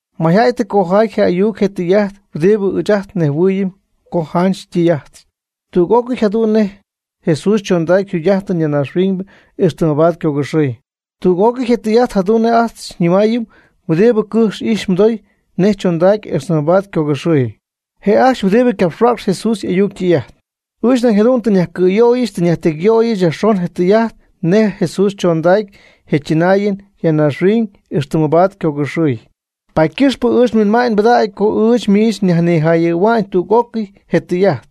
Mayjäy tɨ cojaay je ayuc je tɨy'ajt huɨdi ɨɨch ajt nejhuɨɨyɨm co janch ytɨy'ájtɨty, tüg'ócɨy jadu'n nej Jesús chondacy yjugy'ájtɨn ya naaxhuiñ ixtɨ mabaad ycogɨxɨɨy. Tüg'ócɨy je tɨy'ajt jadu'n nej ajt xyñɨmaayɨm huɨdi cɨ'm ijx mɨdou nej chondacy ixtɨ mabaad ycogɨxɨɨy, je' ajcxy huɨdibɨ capxhuäcxy Jesús y'ayuc ytɨy'ajt. Ɨɨch nañ jadu'n tɨ nyajcɨ̈yöyɨch tɨ nyajtecyyöyɨch yajxon je tɨy'ajt nej Jesús chondacy je' chɨnaayɨn ya naaxhuiñ ixtɨ mabaad ycogɨxɨɨy. Paady ycɨxpɨ ɨɨch nhuinma'ñ pɨdägy co ɨɨch miich nyajnijayɨ̈hua'ñ tüg'ócɨy je tɨy'ajt,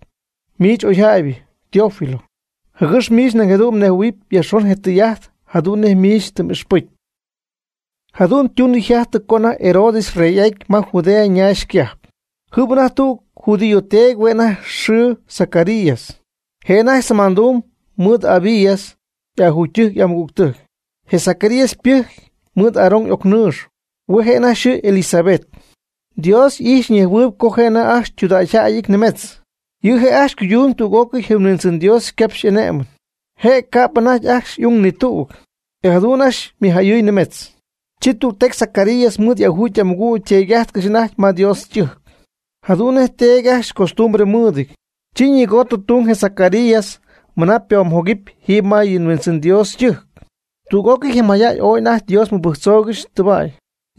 miich oyjäybɨ, Teófilo. Jɨgɨx miich nañ jadu'n mnejhuɨ̈huɨpy yajxon je tɨy'ajt, jadu'n nej miich tɨ m'ixpɨcy. Jadu'n ytunɨ yjajtɨ co anajty Herodes yrey'aty ma Judea naax cajp, jɨm anajty tüg judío teedy hue' anajty yxɨɨ Zacarías. Je' anajty semandumb mɨɨd Abías y'ajugytɨjc y'amɨgügtɨjc. Je Zacarías ypɨjcy mɨɨd Aarón y'ocnɨɨx, hue' je' anajty yxɨɨ Elisabet. Dios y'ijxyp ñejhuɨɨyb co je' anajty ajcxy ytudägyjäyɨty nimetz. Je' ajcxy ycuydumyb tüg'ócɨy yɨ Huindzɨn Dios ycapxy y'ané'mɨn. Je' ca'p anajty ajcxy y'ung ni tüg, e jadu'n ajcxy ymɨjäyɨɨñ nimetz. Chi tügtecy Zacarías mɨɨd y'ajugy y'amɨgüg yteedy'ájtcɨxy anajty ma Dios ytɨjc. Jadu'n nej teedy ajcxy ycostumbre mɨɨdɨty, chi ñigootɨ tung je Zacarías mɨna ypoomjogɨpy jiiby ma yɨ Huindzɨn Dios ytɨjc. Tüg'ócɨy je mayjäy ooy anajty Dios mɨbɨjctzoogɨxy tɨba'y.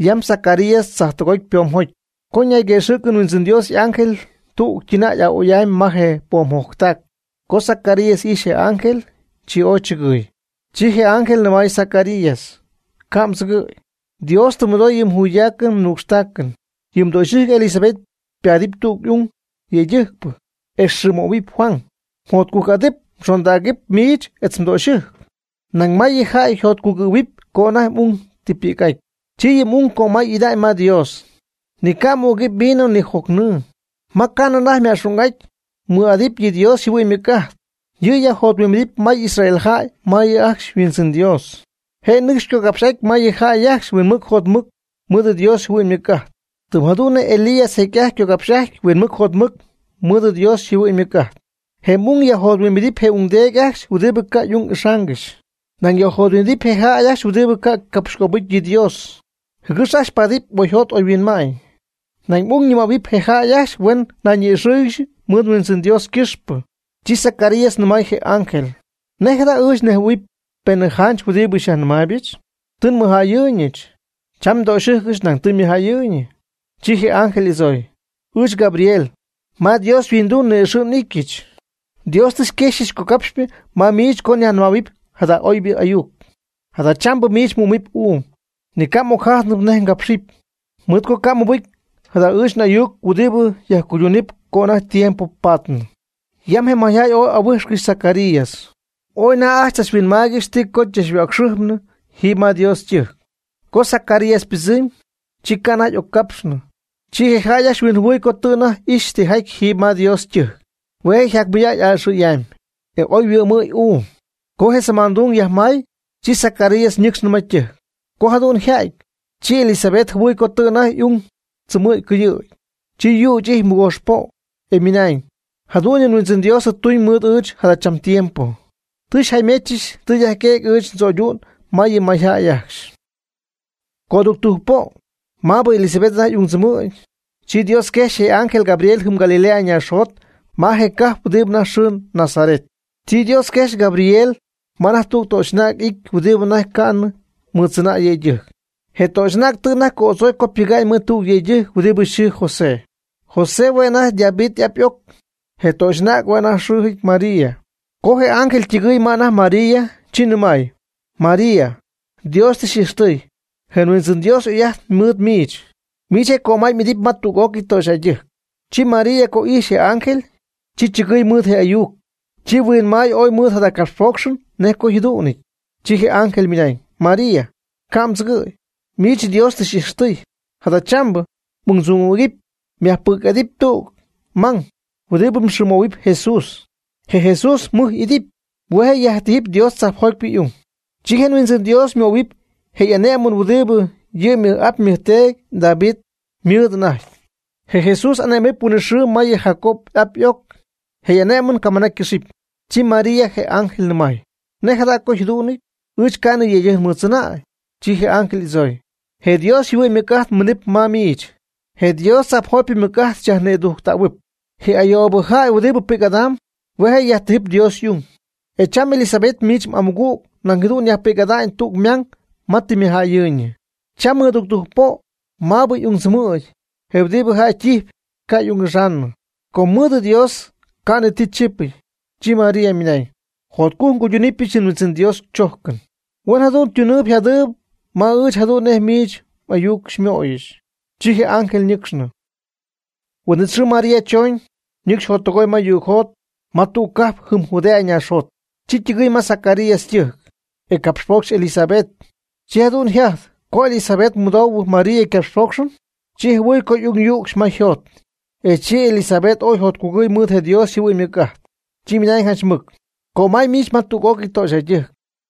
Yam Zacarías tzajtɨgoty ypoomjocy, co ñayquëxɨ̈cɨ Huindzɨn Dios y'ángel tüg ytɨnäy a'oy'amy ma je poomjoctac. Co Zacarías ijxy je ángel, chi ooy chɨgɨɨy. Chi je ángel nɨmaay Zacarías: ―Ca' mdzɨgɨ̈y, tɨ Dios mɨdooy yɨ mjuydácɨn mnucxtácɨn. Yɨ mdöxyɨjc Elisabet ypaadɨpy tüg ung yëydɨjcpɨ, e mxɨɨmöhuɨpy Juan. Mjotcujc'adɨp mxondägɨp miich etz mdöxyɨjc, nañ may yɨ jäy yjotcugɨ̈huɨpy co anajty m'ung tɨ ypi'c'aty. Chi yɨ m'ung ycömay'ida'ñ ma Dios. Ni ca' ügɨpy vino ni jocnɨɨ. Ma ca'nɨ anajty yma'xung'aty ymɨɨd'adɨpy yɨ Dios yjɨhuɨ'ñ ymɨc'ajt. Yɨ' yajjothuimbidɨp may Israel jäy ma yɨ' ajcxy yHuindzɨn Dios. Je' nɨcxy ycogapxy'aty ma yɨ jäy ajcxy huinmɨc jotmɨc mɨɨd Dios yjɨhuɨ'ñ ymɨc'ajt, tɨm jadu'n nej Elías jecy'ajty ycogapxy'ajty huinmɨc jotmɨc mɨɨd Dios yjɨhuɨ'ñ ymɨc'ajt. Je' m'ung yajjothuimbidɨpy je ungdeedy ajcxy huɨdibɨ ca' y'ung ixaangɨxy, nañ yajjothuimbidɨpy je jäy ajcxy huɨdibɨ ca' capxycöbɨcy yɨ Dios, jɨgɨx ajcxy paadɨpy oyjot oyhuinma'ñ. Nañ m'ung ñɨmähuɨpy je jäy ajcxy huen nayñi'ixɨ́ɨyɨgɨxy mɨɨd yHuindzɨn Dios ycɨxpɨ. Chi Zacarías nɨmay je ángel: ―¿Nej jada ɨɨch nejhuɨ̈huɨpy penɨ janch huɨdibɨ xyajnɨmaaybɨch? Tɨ nmɨjjäyɨɨyñɨch, cham ndöxyɨjcɨch nañ tɨ ymɨjjäyɨɨyñɨ. Chi je ángel y'adzooy: ―Ɨɨch Gabriel, ma Dios yhuinduu ni'ixɨ' n'ítyɨch. Dios tɨ xyquexyɨch cogapxy'ajtpɨ ma miich co nyajnɨmähuɨpy jada oybɨ ayuc. Jadachambɨ miich mhuɨ́'mɨpy uum, ni ca' m'ocjájtnɨp nej mgápxɨpy, mɨɨd co ca' mmɨbɨcy jada ɨɨch n'ayuc huɨdibɨ yajcuydunɨp co anajty tiempo patnɨ. Yam je mayjäy ooy ja'ahuíjxcɨxy Zacarías, ooy anajty ajcxy tzachhuinmaaygɨxy ti co chachhuäcxɨpy jiiby ma Dios ytɨjc. Co Zacarías ypɨdzɨmy, chi ca' anajty y'occapxnɨ. Chi je jäy ajcxy huinjɨhuɨɨy co tɨ anajty ixy tijaty jiiby ma Dios ytɨjc. Hue' je' yjacmɨydacy a'ɨxɨ̈y'amy, e oyhuɨ'mɨ̈y uum. Co je semandung yajmay, chi Zacarías ñɨcxnɨ ma ytɨjc. Co jadu'n yjajty, chi Elisabet jɨhuɨɨy co tɨ anajty y'ung tzɨmɨ̈gy cɨyɨ̈ gy. Chi yüch'ijty mɨgoox po', e ymɨnañ: “Jadu'n yɨ Huindzɨn Dios tɨ ytuñ mɨɨd ɨɨch jadachambɨ tiempo, tɨ xyjäymechɨch tɨ yajquëgy ɨɨch ndzöydu'n ma yɨ mayjäy ajcxy.” Co tudujc po' maabɨ Elisabet anajty y'ungtzɨmɨ̈gy, chi Dios quejxy je' y'ángel Gabriel jɨm Galilea naaxjot ma je cajp huɨdi anajty yxɨɨ Nazaret. Chi Dios quejxy Gabriel ma anajty tüg töxy'anäg y'ity huɨdibɨ anajty ca'nɨ mɨdzɨnäy yëydɨjc. Je töxy'anäg tɨ anajty co'adzoy co pɨga'ñ mɨɨd tüg yëydɨjc huɨdi yxɨɨ José. José hue' anajty David y'ap y'oc. Je töxy'anäg hue' anajty yxɨɨjɨty María. Co je ángel ytɨgɨɨy ma anajty María, chi nɨmay: ―María, Dios tɨ xy'ijxtɨy, je Huindzɨn Dios y'oy'ajt mɨɨd miich. Miich je' cömay y'idɨp ma tüg'ócɨy töxyjäydɨjc. Chi María co y'ijxy je ángel, chi chɨgɨɨy mɨɨd je' y'ayuc, chi huinmay ooy mɨɨd jada copxpócxɨn nej co yjadú'ñɨty. Chi je ángel ymɨnañ: ―María, ca' mdzɨgɨ̈y, miich Dios tɨ xy'ijxtɨy. Jadachambɨ, m'ungdzɨmɨ̈gɨp, myajpi'c'adɨpy tüg mang, huɨdibɨ mxɨɨmöhuɨpy JESUS. Je Jesús mɨj y'idɨpy, hue' je' yajtíjɨpy Dios tzajpjotypɨ y'ung. Chi je Huindzɨn Dios möhuɨɨyb je ané'mɨn huɨdi yɨ' ymɨj'ap ymɨjteedy David ymɨɨd anajty. Je Jesús ané'mɨp huinɨxɨɨ ma yɨ Jacob y'ap y'oc. Je' y'ané'mɨn camɨna ycɨxɨpy. Chi María je ángel nɨmaay: ―¿Nej jada co yjadú'nɨty? Ɨɨch ca'nɨ nyëydɨjc mɨɨd tzɨnäy. Chi je ángel y'adzooy: ―Je Dios yjɨhuɨ'ñ ymɨc'ajt minɨp ma miich, je Dios tzajpjotypɨ ymɨc'ájtɨn xyajnïdujttähuɨp, je oyjäybɨ jäy huɨdi pi'c'adam, hue' yajtíjɨpy Dios y'ung. E cham Elisabet miich m'amɨgüg nañ jadu'n yajpi'c'adamy tüg mang ma tɨ ymɨjjäyɨɨyñɨ. Cham mɨdudujc po'bɨ maabɨ y'ung tzɨmɨ̈gy je huɨdibɨ jäy ytijpy ca' y'ung'ixaanɨ, com mɨɨdɨ Dios ca'ni ti chípɨty. Chi María ymɨnañ: ―Jotcujc nguydunɨpyɨch yɨ Huindzɨn Dios chójcɨn, huen jadu'n tuñyii jadyii ma ɨɨch jadu'n nej miich m'ayuc xymöyɨch. Chi je ángel ñɨcxnɨ. Huin'it xɨɨ María choñ, ñɨcxy jottɨgoy ma yugjot, ma tüg cajp jɨm Judea naaxjot. Chi ytɨgɨɨy ma Zacarías ytɨjc, e capxpocxy Elisabet. Chi jadu'n yjajty co Elisabet mɨdoohuɨ María ycapxpócxɨn, chi jɨhuɨɨy co y'ung yücxy ma yjot. E chi je Elisabet ooy yjotcugɨy mɨɨd je Dios yjɨhuɨ'ñ ymɨc'ajt. Chi ymɨnañ janch mɨc: ―Cömay miich ma tüg'ócɨy töxyjäydɨjc,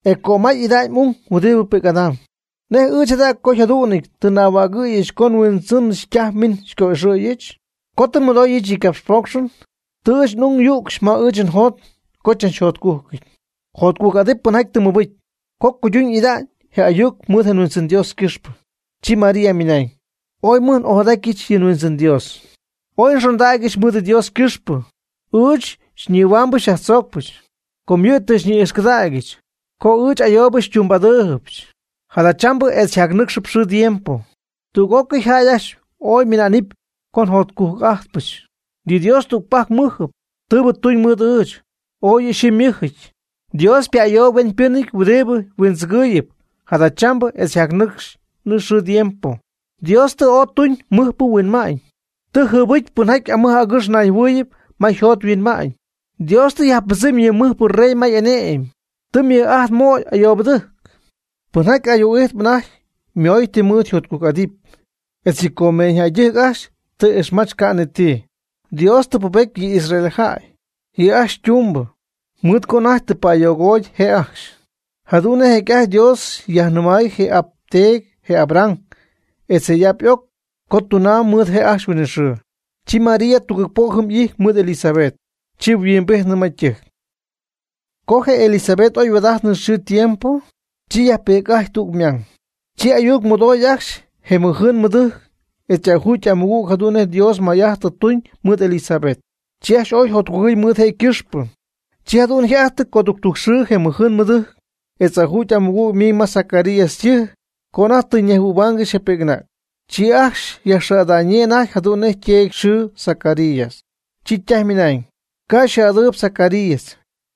e cömay y'ida'ñ m'ung huɨdibɨ pi'c'adamb. ¿Nej ɨɨch jada co jadu'n tɨ n'ahuägɨ̈y co nHuindzɨnɨch ytaj miñ xyco'ixɨ̈yɨch? Co tɨ nmɨdooyɨch yɨ mgapxpócxɨn, tɨ ɨɨch n'ung yücxy ma ɨɨch njot co chachjotcújcɨty. Jotcujc'adɨp pɨnjaty tɨ ymɨbɨcy, co cuyduñ y'ida'ñ je ayuc mɨɨd je Huindzɨn Dios ycɨxpɨ. Chi María ymɨnañ: Ooy mɨj n'ojadatyɨch yɨ Huindzɨn Dios. Ooy nxondägyɨch mɨɨd Dios ycɨxpɨ, ɨɨch nnihuambɨ nyajtzoocpɨ, co yɨ' tɨ xyñi'ijxcɨdägyɨch, co ɨɨch ayoobɨ xytumbɨ'adyíijɨch. Jadachambɨ etz jacnɨcxp xɨɨ tiempo, tüg'ócɨy jäy ajcxy oy mɨna'nɨp co jotcujc'ájtpɨch. Yɨ Dios tügpajc mɨ́jɨp, tɨɨbɨ tun mɨɨd ɨɨch, ooy yɨ' yxɨɨ ymɨ́jɨty. Dios ypa'ayooyb hueñypɨ́nɨty huɨdibɨ huindzɨgɨɨyɨp jadachambɨ etz jacnɨcxnɨ xɨɨ tiempo. Dios tɨ ooy tuñ mɨjpɨ huinma'ñ, tɨ jɨɨbɨcy pɨnjaty amɨj agɨx nayjɨhuɨɨyɨp ma yjot yhuinma'ñ. Dios tɨ yajpɨdzɨmy yɨ mɨjpɨ rey ma y'ane'my, tɨ mɨj'ajt möy ayoobɨdɨjc. Pɨnjaty ayuu'ijtp anajty ymooy ti mɨɨd yjotcujc'adɨp, etz yɨ comeeñyjäydɨjc ajcxy tɨ ixmach ca' ni ti. Dios tɨ pubety yɨ Israel jäy, yɨ' ajcxy ytumbɨ, mɨɨd co anajty tɨ pa'ayogoty je' ajcxy, jadu'n nej jecy'ajty Dios yajnɨmay je' n'ap ndeedy, je Abraham etz je'y'ap y'oc, co tunamb mɨɨd je' ajcxy huinɨxɨɨ. Chi María tugɨɨg po' jɨm y'ijty mɨɨd Elisabet, chi yhuimbijtnɨ ma ytɨjc. Co je Elisabet oy yajhuaad'ajtnɨ xɨɨ tiempo, chi yajpi'c'ajty tüg ymang. Chi ayuc mɨdooy ajcxy je ymɨjɨɨn ymɨdɨjc etz y'ajugy y'amɨgüg jadu'n nej Dios may'ajt tɨ tuñ mɨɨd Elisabet. Chi ajcxy ooy yjotcugɨy mɨɨd je' ycɨxpɨ. Chi jadu'n yjajty coductujc xɨɨ je ymɨjɨɨn ymɨdɨjc etz y'ajugy y'amɨgüg miñ ma Zacarías ytɨjc co anajty tɨy'ajttɨ̈huaangɨxy je pi'c'anäg. Chi ajcxy yajxɨɨ'ada'ñyii anajty jadu'n nej yteedy yxɨɨ Zacarías. Chi ytaj ymɨnañ: ―Ca' xɨɨ'adɨɨyb Zacarías,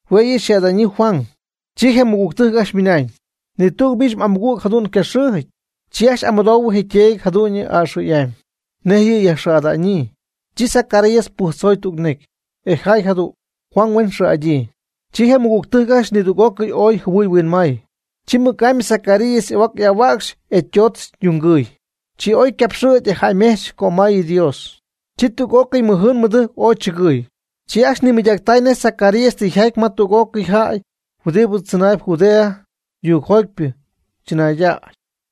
hue' yɨ' huen xɨɨ'adyii Juan. Chi je' ymɨgügtɨjc ajcxy ymɨnañ: ―¿Na'amy? Ni tüg miich m'amɨgüg jadu'n ca' xɨ́ɨjɨty. Chi ajcxy y'amɨdoohuɨ je' yteedy jadu'n a'ɨxɨ̈y'amy, nej yɨ' yajxɨɨ'ada'ñyii. Chi Zacarías pɨjctzoy tüg necy, e jaay jadu'n: “Juan huen xɨɨ'adyii.” Chi je ymɨgügtɨjc ajcxy nidüg'ócɨy ooy jɨhuɨɨy huinmaay. Chi mɨc'amy Zacarías y'ahuac ahua'cxy e ytoodz yungɨɨy, chi oy ycapxɨ̈gy e jäymejch cömay yɨ Dios. Chi tüg'ócɨy ymɨjɨɨn ymɨdɨjc ooy chɨgɨɨy. Chi ajcxy nimɨydactay nej Zacarías tɨ yjaty ma tüg'ócɨy jäy huɨdibɨ tzɨnaayb Judea yuugjotypɨ tzɨnaaydac.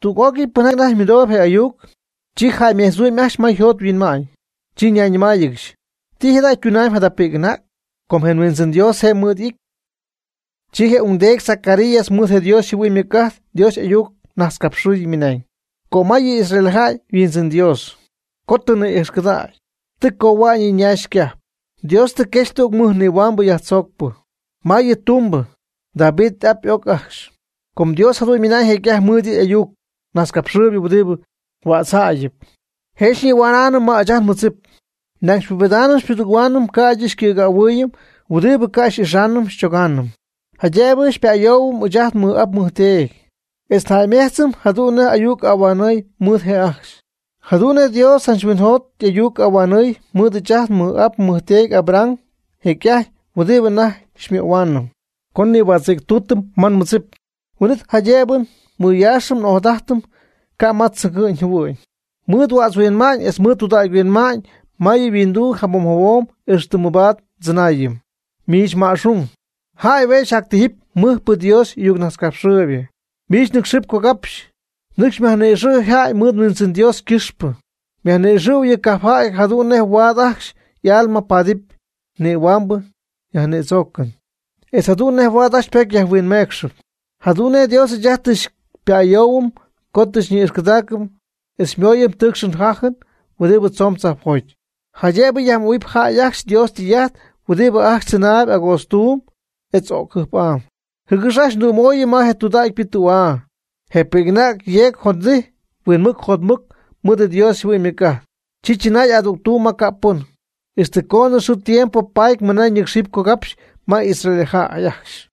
Tüg'ócɨy pɨnjaty anajty mɨdoob je ayuc, chi jäymejtzhuɨ'm ajcxy ma yjot yhuinma'ñ, chi ñayñɨmáayɨgɨxy: ―¿Ti jada' ytunamyb jada pi'c'anäg? Com je Huindzɨn Dios je' mɨɨd y'ity. Chi je ungdeedy Zacarías mɨɨd je Dios yjɨhuɨ'ñ ymɨc'ajt Dios y'ayuc najtzcapxɨɨyɨ ymɨnañ: Cömay yɨ Israel jäy yHuindzɨn Dios, co tɨ ni'ijxcɨdägy, tɨ cohua'ñ yɨ' ñaax ycajp, Dios tɨ quexy tüg mɨj nihuaambɨ yajtzoocpɨ, ma yɨ' ytumbɨ, David y'ap y'oc ajcxy. Com Dios jadu'n ymɨnañ jecy'ajty mɨɨd yɨ' y'ayuc najtzcapxɨɨyb huɨdibɨ huätzjäyɨp; je' xyñihuänaanɨm ma ɨɨch ajt nmɨdzip, nañ xypubedaanɨm xypudɨgɨ́huaanɨm ca'ydɨ xycɨ̈gähuɨɨyɨm huɨdibɨ ca' xy'ixaanɨm xychogaanɨm. Jaydëbɨ pa'ayoohuɨpy ɨɨch ajt nmɨj'ap nmɨjteedy, etz jäymedzɨɨyb jadu'n nej ayuc ahuanɨɨy mɨɨd je' ajcxy. Jadu'n nej Dios janch huinɨjot y'ayuc ahuanɨɨy mɨɨd ɨɨch ajt nmɨj'ap nmɨjteedy Abraham jecy'ajty huɨdi anajty xymöhuaanɨm. Co nihuätzɨ̈ctuutɨm ma nmɨdzip, huin'it jaydëbɨ mɨyaaxɨm n'ojadájtɨm ca' ma tzɨgɨ'ñ jɨhuɨ'ñ, mɨɨd huätzhuinma'ñ etz tudägy huinma'ñ ma yɨ' yhuinduu jabom jabom ixtɨ mɨbaad ndzɨnaayɨm. Miich ma'xung, jäy hue' myajtijɨp mɨjpɨ Dios y'ayucnajtzcapxɨɨybɨ. Miich nɨ́cxɨp cogapxy, nɨcx yajni'ixɨ̈ jäy mɨɨd Huindzɨn Dios ycɨxpɨ. Yajni'ixɨ' yɨ cajpjäy jadu'n nej huaad ajcxy y'alma paadɨpy nihuáanɨn yajnïdzoocɨn, etz jadu'n nej huaad ajcxy ypocy huinmecxɨɨyb. Jadu'n nej Dios ɨɨch ajt tɨ xypa'ayoohuɨm co tɨ xyñi'ijxcɨdaacɨm etz xymooyɨm tɨɨcxɨn jájɨn huɨdibɨ tzomb tzajpjoty, jaydëbɨ yajmöhuɨpy jäy ajcxy Dios ytɨy'ajt huɨdibɨ ajcxy tzɨnaayb agootztuum etz o'c jɨjp'am, jɨgɨx ajcxy xytümooyɨm ma je tudägypɨ tü'aa. Je pi'c'anäg yeeg yjodijy huinmɨc jotmɨc mɨɨd yɨ Dios yjɨhuɨ'ñ ymɨc'ajt. Chi chɨnaay adügtuum ma ca' pɨn, ixtɨ coonɨ xɨɨ tiempo paty mɨna ñɨ́cxɨpy cogapxy ma Israeljäy ajcxy.